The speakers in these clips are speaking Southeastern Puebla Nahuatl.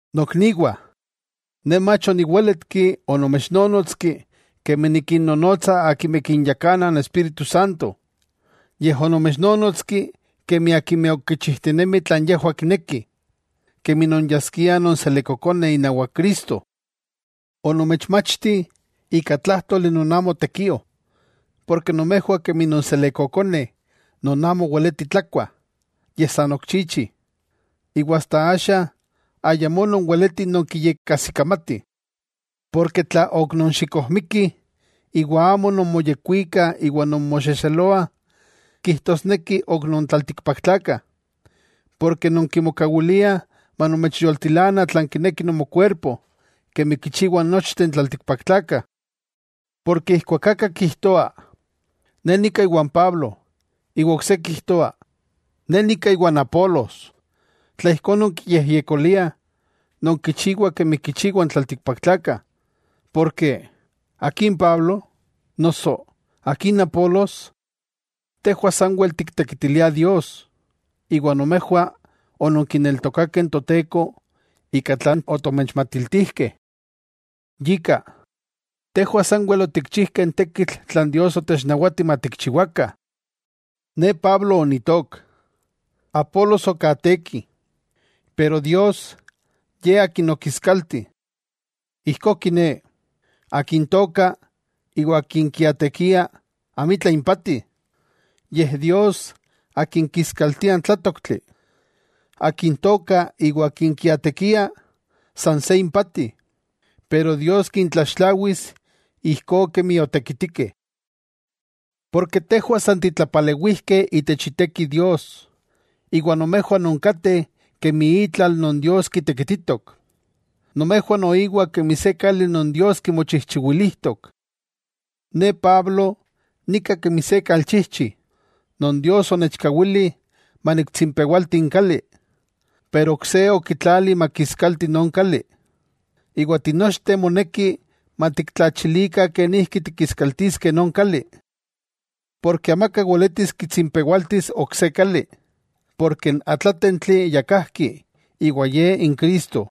Nokniwah, ne mach oniwéletki onomechnónotski kemi nikinnonotsa akimeh kinyakana n Espíritu Santo, yej onomechnonotski kemi akimeh ok kichijtinemih tlan yejwah kinekih, kemi nonyaskiah nonselekkokoneh inawak Cristo. Onomechmachti ika tlájtoli non amo tekio, porke nomejwah kemi nonselekkokoneh non amo weletih tlakuah, yej san ok chichih, iwa asta axa ayamó nonweletih nonkiyekkajsikamatih. Porke tla ok nonxikojmikih, iwa amo nonmoyekwikah iwa nonmoxexeloah, kijtosneki ok non tlaltikpaktlakah, porke nonkimokawiliah manomechyoltilana tlan kineki nomokuerpo kemi kichiwah nochteh n tlaltikpaktlakah. Porke ijkuak aka kijtoa: “Ne nika iwan Pablo”, iwa ok se kijtoa: “Ne nika iwan Apolos”. Tla ijkó nonkiyejyekoliah, nonkichiwah kemi kichiwah n tlaltikpaktlakah. Porke, ¿akin Pablo?, noso ¿akin Apolos? Tejwah sanwel tiktekitiliah Dios, iwa nomejwah ononkineltokakeh n Toteko ika tlan otomechmatiltijkeh. Yika, tejwah sanwel otikchijkeh n tekitl tlan Dios otechnawati matikchiwakah. Ne Pablo onitook, Apolos okaateki, pero Dios, Ye akin okiskalti. Ijkó kiné, akin tooka, iwa akin kiaatekia, amitla impati, yej Dios Akin kiskaltia n tlátoktli. Akin tooka iwa akin kiaatekia, san se impati, pero Dios kintlaxtlawis ijkó kemi otekitikeh. Porke tejwah san titlapalewijkeh itech iteki Dios, iwa nomejwah nonkateh kemi itlal non Dios kitekititok. Nomejwah noiwa kemi se kali non Dios kimochijchiwilijtok. Ne Pablo nika kemi se kalchijchi, non Dios onechkawili maniktsimpewalti n kali, pero ok se okitlali makiskalti non kali. Iwa tinochteh moneki matiktlachilikah kenijki tikiskaltiskeh non kali. Porke amaka weletis kitsimpewaltis ok se kali, porke n atlátentli ya kajki iwa Ye n Cristo.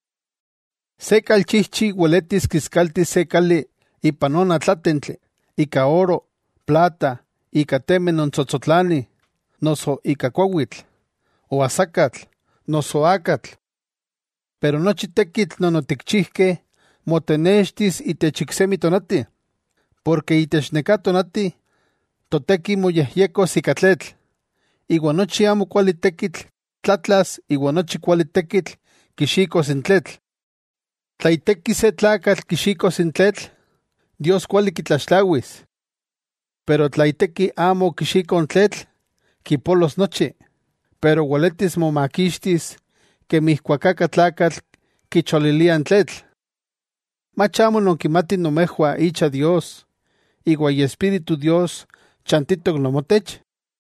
Se kalchijchi weletis kiskaltis se kali ipan non atlátentli ika oro, plata ika temeh non tsotsotlanih, noso ika kuawitl, oasakatl noso akatl. Pero nochi tekitl non otikchijkeh motenextis itech n iksemi tonati, porke itech neká tonati toteki moyejyekos ika tletl, iwa nochi amokuali tekitl tlatlas iwa nochi kuali tekitl kixikos n tletl. Tla iteki se tlakatl kixikos n tletl, Dios kuali kitlaxtlawis. Pero tla iteki amo okixiko n tletl, kipolos nochi, pero weletis momakixtis kemi ijkuak aka tlakatl kicholilia n tletl. ¿Mach amo nonkimatih nomejwah icha Dios, iwa Iespíritu Dios chantitok nomotech?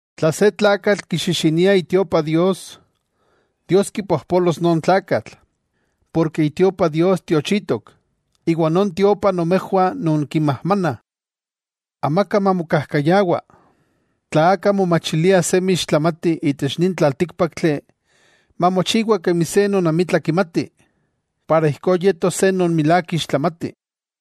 Tla se tlakatl kixixinia itiopa Dios, Dios kipojpolos non tlakatl. Porke itiopa Dios tiochitok, iwa non tiopa nomejwah nonkimajmanah. Amaka mamokajkayawa. Tla aka momachilia semi ixtlamati itech nin tlaltíkpaktli, mamochiwa kemi se non amitla kimati, para ijkó yetos se non milák ixtlamati.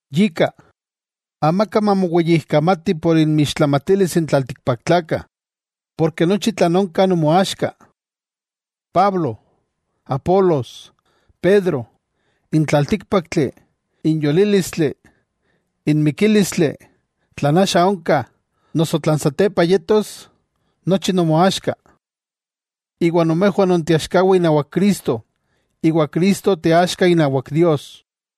Yika, amaka mamoweyijkamati por inmixtlamatilis n tlaltikpaktlakah, porke nochi tlan onka nomoaxka. Pablo, Apolos, Pedro, n tlaltíkpaktli, n yolílistli n mikílistli, tlan axa onka, noso tlan satepa yetos, nochi nomoaxka, iwa nomejwah nonteaxkawah inawak Cristo, iwa Cristo teaxka inawak Dios.